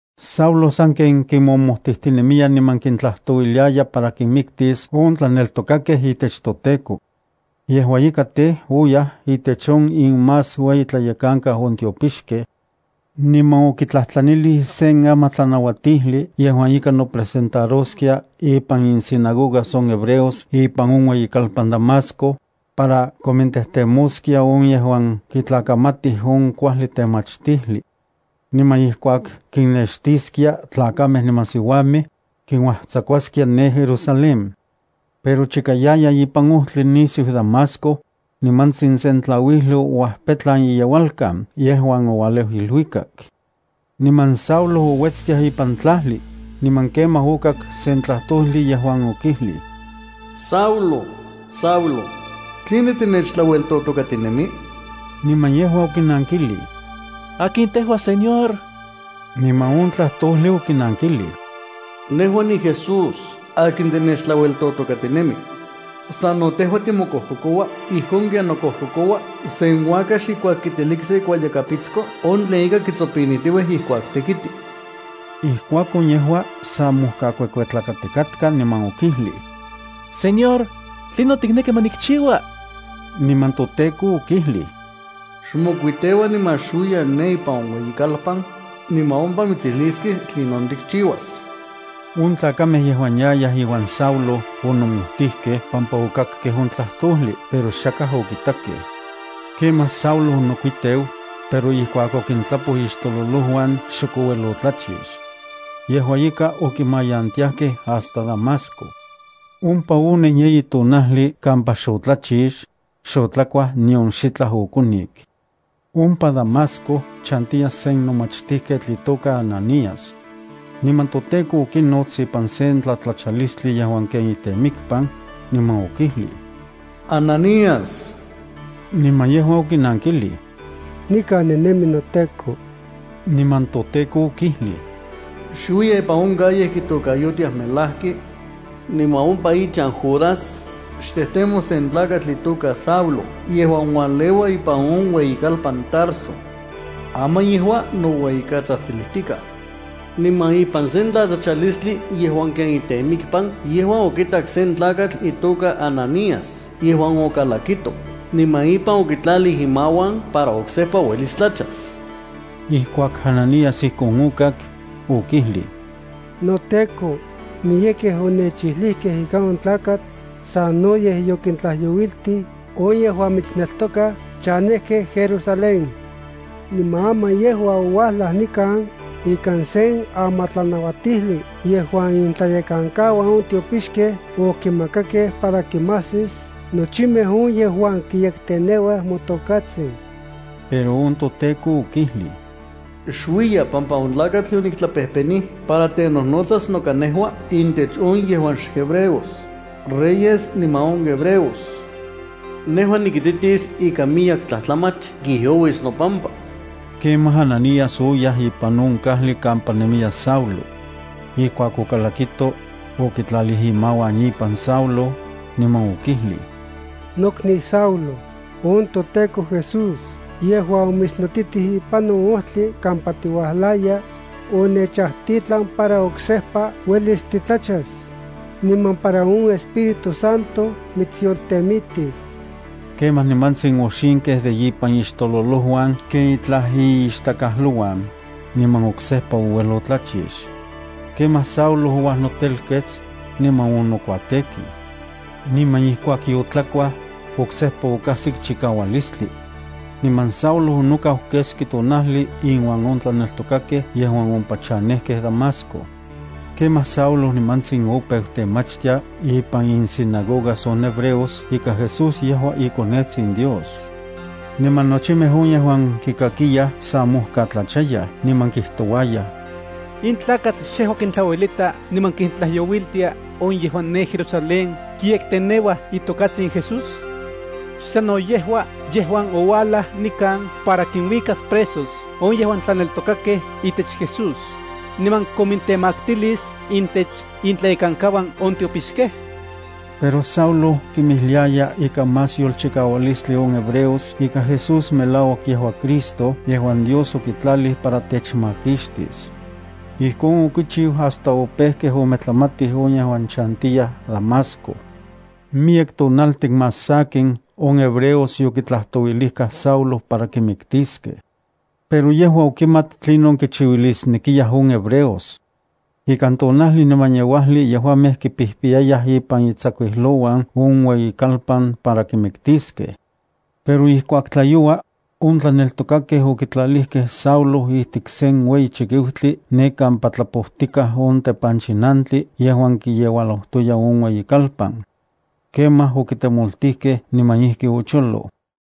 Saulo sanken kinmomojtijtinemiya niman kintlajtouiliya para kinmiktis on tlaneltokakej itech toTEKO. Yejua ika tej, oyaj itech on inmasueyitlayekankau on tiopixkej, niman okitlajtlanilij sen amatlanauatijli yejuan ika nopresentaroskia ipan insinagogas on hebreos ipan on ueyikalpan Damasco, para komintejtemoskia on yejuan kitlakamatij on kuajli temachtijli. Niman ijkuak kinnextiskia tlakamej niman siuamej, kinuajtsakuaskia ne Jerusalén. Pero chika yaya ipan ojtli nisiu Damasco, nimantsin sen tlauijli ouajpetlan iyeualkan yejuan oualeu iluikak. Niman Saulo ouetstiaj ipan tlajli, niman kemaj okak sen tlajtojli yejuan okijlij: —Saulo, Saulo, ¿tline tinechtlaueltotokatinemi? Niman yejua okinankilij: —¿Akin tejua Señor? Niman on tlajtojli okinankilij: —Nejua niJesús akin tinechtlaueltotokatinemi. Sano tejua timokojkokoua ijkon ken nokojkokoua sen uakax ijkuak kiteliksa ikuayakapitsko on tlen ika kitsopinijtiuij ijkuak tekiti. Ijkuakon yejua sa mojkakuekuetlakatikatka, niman okijlij: —Señor, ¿tlinon tikneki ma nikchiua? Niman on toTEKO okijlij: —Xmokuiteua niman xuiya ne ipan on ueyikalpan, niman ompa mitsijliskej tlinon tikchiuas. On tlakamej yejuan yayaj iuan Saulo onomojtijkej pampa okakkej on tlajtojli pero xakaj okitakej. Kemaj Saulo onokuiteu, pero ijkuak okintlapoj ixtololojuan xok ouel otlachix. Yejua ika, okimayantiajkej hasta Damasco. Ompa onen yeyi tonajli kampa xotlachix, xotlakuaj nion xitlaj okonik. Ompa Damasco chantiya sen nomachtijketl itoka Ananías. Niman toTEKO okinots ipan sen tlatlachalistli yejuan ken itemikpan, niman okijlij: —Ananías. Niman yejua okinankilij: —Nikan ninemi noTEKO. Niman toTEKO okijlij: —Xuiya ipan on calle kitokayotiaj “Melajki”. Niman ompa ichan Judas, xtejtemo sen tlakatl itoka Saulo yejuan ualeua ipan on ueyikalpan Tarso. Aman yejua noueyikatsajtsilijtikaj. Niman ipan sen tlatlachalistli yejuan ken itemikpan yejua okitak sen tlakatl itoka Ananías yejuan okalakito, niman ipan okitlalij imauan para oksejpa uelis tlachas. Ijkuak Ananías ijkon okak, okijlij: —NoTEKO, miyekej onechijlijkej ika on tlakatl sanoyej yokintlajyouiltij on yejuan mitsneltokaj chanejkej Jerusalén. Niman aman yejua ouajlaj nikan ikan sen amatlanauatijli yejuan intlayekankauan on tiopixkej okimakakej para kinmajsis nochimej on yejuan kiyekteneuaj motokatsin. Pero on toTEKO okijlij: —Xuiya, pampa on tlakatl yoniktlapejpenij para tenojnotsas noka nejua intech on yejuan xhebreos, reyes niman on hebreos. Nejua nikititis ika miyek tlajtlamach kijyouis nopampa. Kemaj Ananías oyaj ipan on kajli kampa nemiya Saulo. Ijkuak okalakito, okitlalij imauan ipan Saulo, niman okijlij: —Nokniu Saulo, on toTEKO Jesús yejuan omitsnotitij ipan on ojtli kampa tiuajlaya, onechajtitlan para oksejpa uelis titlachas, niman para on Espíritu Santo mitsyoltemitis. Kemaj nimantsin oxinkej de ipan ixtololojuan ken itlaj iixtakajlouan, niman oksejpa ouel otlachix. Kemaj Saulo ouajnotelkets, niman onokuatekij. Niman ijkuak yotlakuaj, oksejpa okajsik chikaualistli. Niman Saulo onokau keski tonajli inuan on tlaneltokakej yejuan ompa chanejkej Damasco. Kemaj Saulo nimantsin opeu temachtia ipan insinagogas on hebreos ika Jesús yejua iKonetsin Dios. Niman nochimej on yejuan kikakiyaj sa mojkatlachayaj, niman kijtouayaj: —¿In tlakatl xejua kintlauelita niman kintlajyouiltia on yejuan ne Jerusalén kiyekteneuaj itokatsin Jesús? ¿Xsanno yejua yejuan ouajlaj nikan para kinuikas presos on yejuan tlaneltokakej itech Jesús, niman komintemaktilis intech intlayekankauan on tiopixkej? Pero Saulo kinmijliaya ikan más yolchikaualistli on hebreos ika Jesús melauak yejua Cristo yejuan Dios okitlalij para techmakixtis. Ijkon okichiu hasta opejkej ometlamatij on yejuan chantiyaj Damasco. Miyek tonaltin más sakin on hebreos yokitlajtouilijkaj Saulo para kimiktiskej. Pero yejua okimat tlinon kichiuilisnekiyaj on hebreos. Ikan tonajli niman yeuajli yejuamej kipijpiyayaj ipan itsakuijlouan on ueyikalpan para kimiktiskej. Pero ijkuak tlayoua, on tlaneltokakej okitlalijkej Saulo ijtik sen ueyi chikiutli ne kampa tlapojtikaj on tepanchinantli yejuan kiyeualojtoya on ueyikalpan. Kemaj okitemoltijkej niman ijki ocholoj.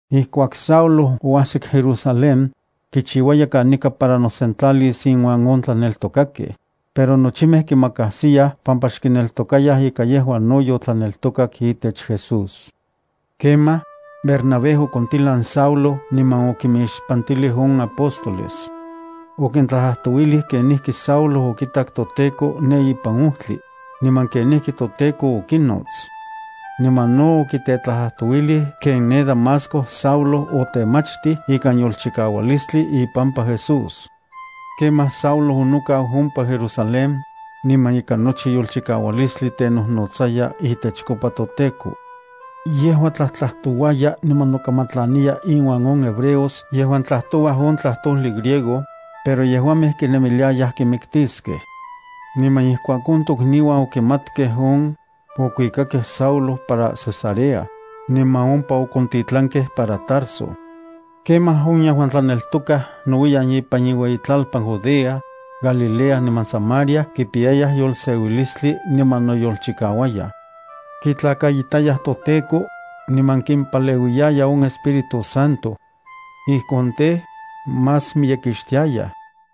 Ijkuak Saulo oajsik Jerusalén, kichiuaya kanika para nosentlalis inuan on tlaneltokakej, pero nochimej kimakajsiyaj pampa xkineltokayaj ika yejua no yotlaneltokak itech Jesús. Kemaj, Bernabé okontilan Saulo niman okimixpantilij on apóstoles. Okintlajtlajtouilij kenijki Saulo okitak toTEKO ne ipan ojtli, niman kenijki toTEKO okinots. Niman no okitetlajtlajtouilij ken ne Damasco Saulo otemachtij ikan yolchikaualistli ipampa Jesús. Kemaj Saulo onokau ompa Jerusalén, niman ikan nochi yolchikaualistli tenojnotsaya itechkopa toTEKO. Yejua tlajtlajtouaya niman nokamatlaniya inuan on hebreos yejuan tlajtouaj on tlajtojli griego, pero yejuamej kinemiliayaj kimiktiskej. Niman ijkuak on tokniuan okimatkej on, okuikakej Saulo para Cesarea, niman ompa okontitlankej para Tarso. Kemaj on yejuan tlaneltokaj nouiyan ipan inueyitlalpan Judea, Galilea niman Samaria kipiyayaj yolseuilistli niman noyolchikauayaj. Kitlakaitayaj on toTEKO, niman kimpaleuiya on Espíritu Santo. Ijkon tej, más miyekixtiayaj.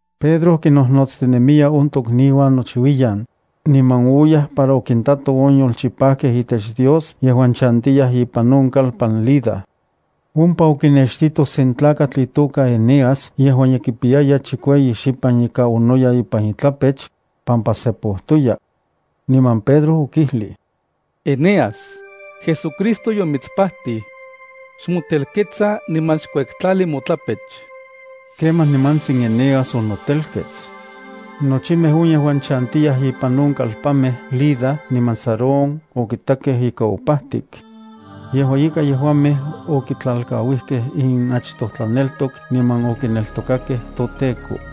Pedro kinnojnotstinemiya on tokniuan nochiuiyan, niman oyaj para okintato on yolchipajkej itech Dios yejuan chantiyaj ipan on kalpan Lida. Ompa okinextito sen tlakatl itoka Eneas yejuan ye kipiyaya chikueyi xipan ika onoya ipan itlapech, pampa sepojtoya. Niman Pedro okijlij: —Eneas, JesuCristo yomitspajtij. Xmotelketsa niman xkuektlali motlapech. Kemaj nimantsin Eneas onotelkets. Nochimej on yejuan chantiyaj ipan on kalpanmej Lida niman Sarón okitakej ika opajtik. Yejua ika, yejuamej okitlalkauijkej inachtoj tlaneltok niman okineltokakej toTEKO.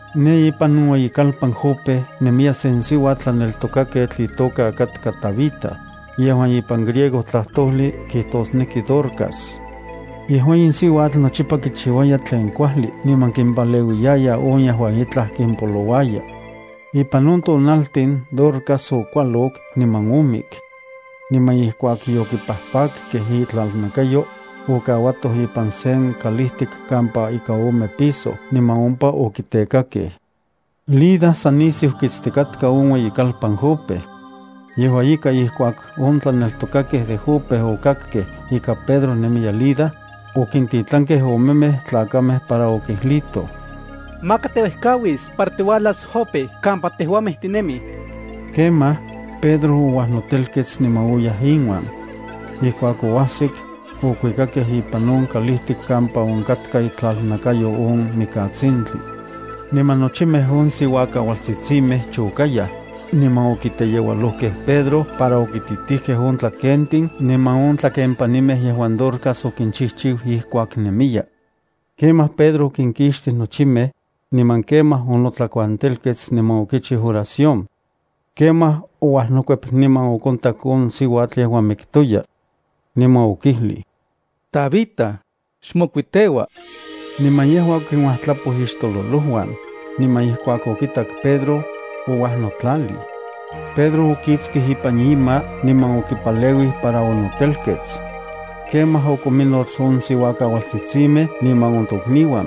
Ne ipan on ueyikalpan Jope nemiya sen siuatl tlaneltokaketl itoka katka Tabita, yejuan ipan griego tlajtojli kijtosneki Dorcas. Yejua in siuatl nochipa kichiuaya tlen kuajli niman kimpaleuiyaya on yejuan itlaj kimpolouaya. Ipan on tonaltin Dorcas okualok niman omik. Niman ijkuak yokipajpakkej itlalnakayo, okauatoj ipan sen kalijtik kampa ika ome piso niman ompa okitekakej. Lida san nisiu kitstikatka on ueyikalpan Jope. Yejua ika ijkuak on tlaneltokakej de Jope okakkej ika Pedro nemiya Lida, okintitlankej omemej tlakamej para okijlijtoj: —Maka tiuejkauis para tiuajlas Jope kampa tejuamej tinemij. Kemaj, Pedro ouajnotelkets niman oyaj inuan. Ijkuak oajsik, okuikakej ipan on kalijtik kampa onkatka itlalnakayo on mikatsintli. Niman nochimej on siuakauatsitsimej chokayaj niman okiteyeualojkej Pedro para okititijkej on tlakentin niman on tlakenpanimej yejuan Dorcas okinchijchiu ijkuak nemiya. Kemaj Pedro okinkixtij nochimej, niman kemaj onotlakuantelkets niman okichiu oración. Kemaj ouajnokuep niman okontak on siuatl yejuan miktoya. Niman okijlij: —Tabita, xmokuiteua. Niman yejua okinuajtlapoj ixtololojuan, niman ijkuak okitak Pedro, ouajnotlalij. Pedro okiktsij ipan ima niman okipaleuij para onotelkets. Kemaj okominnots on siuakauatsitsimej niman on tokniuan,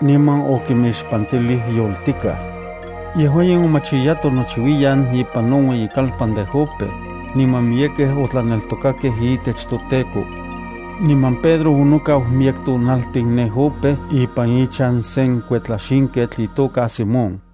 niman okimixpantilij yoltikaj. Yejua in omachiyato nouiyan ipan on ueyikalpan de Jope, niman miyekej otlaneltokakej itech toTEKO. Niman Pedro onokau miyek tonaltin ne Jope ipan ichan sen kuetlaxinketl itoka Simón.